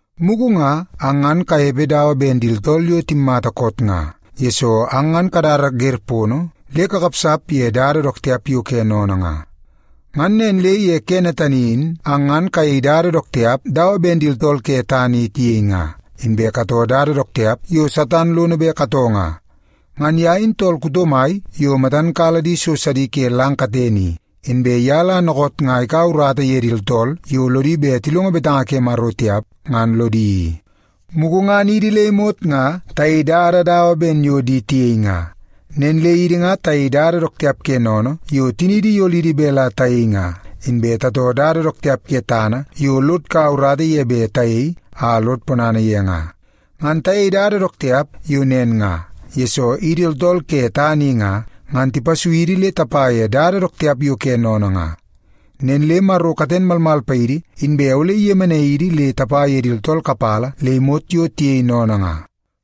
Mugu nga ang ngan kanepe dawa ben di tooltool yo timmata koot nga, yesoo ang ngan kadada wer pono le kakapsap ye dada dook tiap yo ke sennene nga. Ngan nen le ye kene tani in ang ngan kayei dada dook tiap dawa ben di tooltool ke tana i tiyei nga, inbe katoo dada dook tiap yo Satan lono bet katoo nga. Ngan ye in tool kuto mai yo matan kala di so sidi ke lang katene i, inbe ye la dookoot nga ikaua urata ye di tooltool yo lodi bet tilongo betanga ke Maro tiap, ngan lodi i. Mugu ngan idi le imot nga tayei dada dawa ben yo di tiyei nga. Nen le idi nga tayei dada dook tiap ke sennene yo tiniidi iyolidi bet la tayei nga, inbe tatoo dada dook tiap ke tana yo lod kaua urata ye bet tayei a lod ponana ye nga. Ngan tayei dada dook tiap yo nen nga, yesoo idi tooltool ke tana i nga, ngan tipasui idi le tapa ye dada dook tiap yo ke sennene nga. Nen le Maro katen malmal paidi inbe ole iyemenai idi le tapa ye di tooltool kapala le imot yo tiyei sennene nga.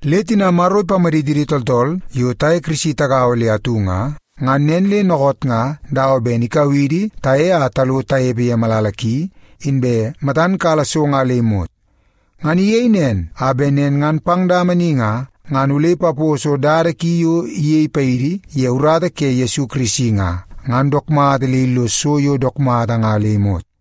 Le tina Maro ipamaditidi tooltool yo taye Kirisi tagaua le atu nga, ngan nen le dookoot nga dawa ben ikau idi taye a talo tanepe ye malala ki, inbe matan kala so nga le imot. Ngan iyei nen a bet nen ngan pang dama ni nga, ngan ole ipapos dada ki yo iyei paidi ye urata ke Yesu Kirisi nga, ngan dook mata le illos so yo dook mata nga le imot.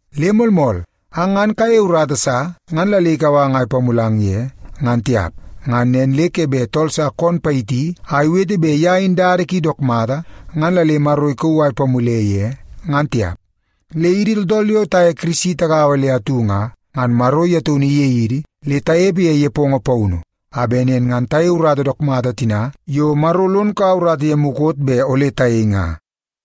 Le moolmool, ang ngan kayeie urata sa ngan la le ikau ang a ipamulang ye, ngan tiap. Ngan nen le ke bet tool sa koon payiti a iwete bet ye in dada ki dook mata, ngan la le Maro ikauu a ipamule ye, ngan tiap. Le idi tooltool yo taye Yesu Kirisi tagaua le atu nga, ngan Maro ye taunu iyei idi le tanepe ye nepongo paunu, a bet nen ngan tayei urata dook mata tina yo Maro lon kaua urata ye mukot bet ole tayei nga.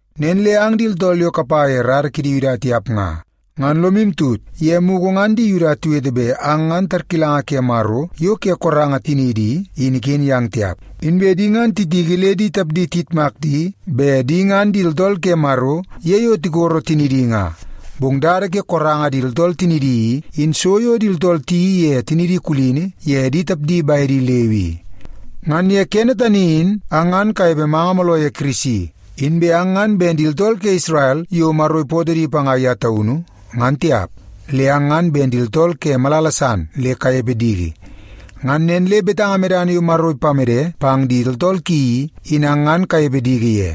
Nen le ang di tooltool yo kapa ye rara ke di Yuda tiap nga, ngan lomu tut ye mugu ngan di Yuda tiwete bet ang ngan tarkilanga ke Maro yo ke koranga tiniidi i, in iken yang tiap. Inbe di ngan titiki le di tapdi tiyitmak di bet di ngan di tooltool ke Maro ye yo tikoro tinidi nga. Bong dada ke koranga di tooltool tinidi i, in so yo di tooltool tiyeii ye tinidi kulini ye di tapdi bedi leu i. Ngan ye kene tani in ang ngan kanepe manga mooloo ye Kirisi. Inbe ang ngan ben di tooltool ke Isrel yo Maro ipootoo di panga ye taunu, ngan tiap, le ang ngan ben di tooltool ke malala san le kanepe diki. Ngan nen le betanga medana yo Maro ipamede pang di tooltool ki i, in ang ngan kanepe diki ye.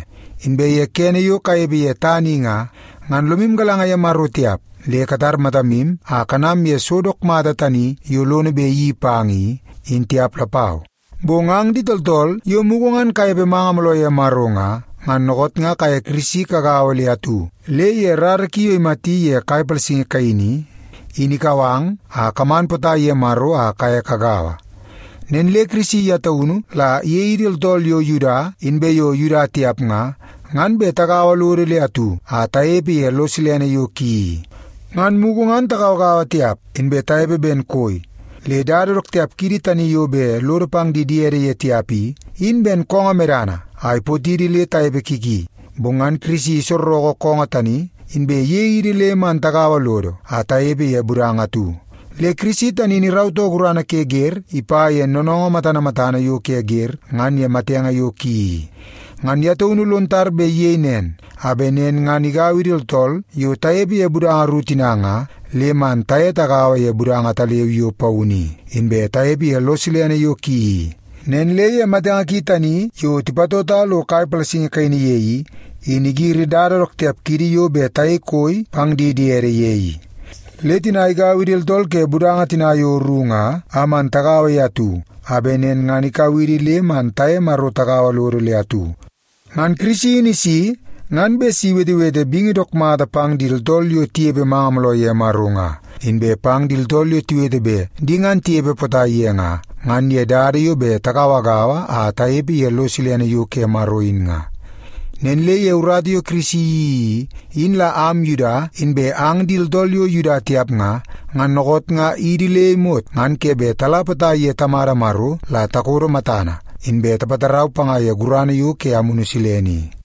Inbe ye kene yo kanepe ye tana i nga, ngan lomu galanga ye Maro tiap, le katar matamu a kanam ye so dook mata tani yo lono bet iyeii pang i, in tiap lapau. Bong ang di tooltool yo mugu ngan kanepe manga mooloo ye Maro nga, ngan dookoot nga kaye Yesu Kirisi kagaua le atu, le ye rara ki yo imati ye kai palasingi kaini i, in ikau ang a kaman potai ye Maro a kaye kagaua. Nen le Kirisi ye taunu la iyei idi tooltool yo Yuda inbe yo Yuda tiap nga, ngan bet tagaua lodo le atu a tanepe ye lo silene yo ki i. Ngan mugu ngan tagauagaua tiap, inbe tanepe ben koi. Le dada dook tiap kiidi tani yo bet lodo pang di diede ye tiap i, in ben koongoo medana a ipotidi le tanepe ki ki. Bong ngan Kirisi isorreke koongoo tani, inbe iyei idi le man tagaua lodo a tanepe ye budanga atu. Le Kirisi tani in irautoo gurana ke wer ipa ye noonoongoo matana matana yo ke wer ngan ye matenge yo ki i. Ngan ye taunu lon tar bet iyei nen, a bet nen ngan igau idi tooltool yo tanepe ye budanga ru tina nga, le man taye tagaua ye budanga ataleu yo paunu i, inbe tanepe ye lo silene yo ki i. Nen le ye matenge ki tani yo tipatota lo kai palasingi kaini ye i, in igiri dada dook tiap kiidi yo bet tayei koi pang di diede ye i. Le tina igau idi tooltool ke budanga tina yo ru nga a man tagaua ye atu, a bet nen ngan ikau idi le man taye Maro tagaua lodo le atu. Ngan Kirisi in isi ngan bet si iwetewete bingi dook mata pang di tooltool yo tinepe manga mooloo ye Maro nga, inbe pang di tooltool yo tiwete bet di ngan tinepe potai ye nga, ngan ye dada yo bet tigauagaua a tinepe ye lo silene yo ke Maro in nga. Nen le ye urata yo Kirisi iyeii i, in la am Yuda inbe ang di tooltool yo Yuda tiap nga, ngan dookoot nga idi le imot ngan ke bet tala potai ye Tamada Maro la takodo matana, inbe tapatarau panga ye gurana yo ke Amunu Silene i.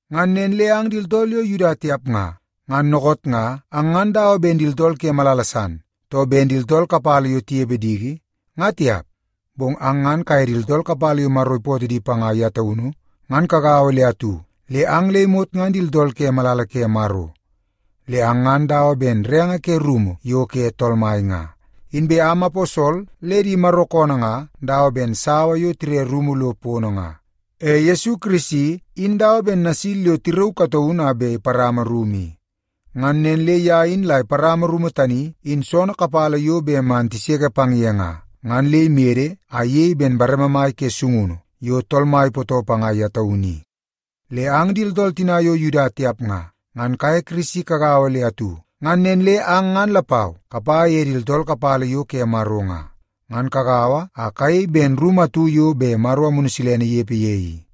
Ngan nen le ang di tooltool yo Yuda tiap nga, ngan dookoot nga ang ngan dawa ben di tooltool ke malala san, too ben di tooltool kapala yo tinepe diki, nga tiap. Bong ang ngan kaye di tooltool kapala yo Maro ipootoo di panga ye taunu, ngan kagaua le atu, le ang le imot ngan di tooltool ke malala ke Maro. Le ang ngan dawa ben renge ke rumu yo ke Tool Mai nga. Inbe am aposol le di Maro koonoo nga dawa ben sawa yo tire rumu lo pono nga. E Yesu Kirisi in dawa ben nasil yo tirauu kataunu a bet iparama rumu i. Ngan nen le ye in la iparama rumu tani in soonoo kapala yo bet man tiseke pang ye nga, ngan le imede a iyei ben bareme mai ke sungunu yo Tool Mai ipootoo panga ye taunu i. Le ang di tooltool tina yo Yuda tiap nga, ngan kaye Kirisi kagaua le atu, ngan nen le ang ngan lapau kapa ye di tooltool kapala yo ke Maro nga, ngan kagaua a kayei ben rumu atu yo bet Maro Amunu Silene inepe ye i.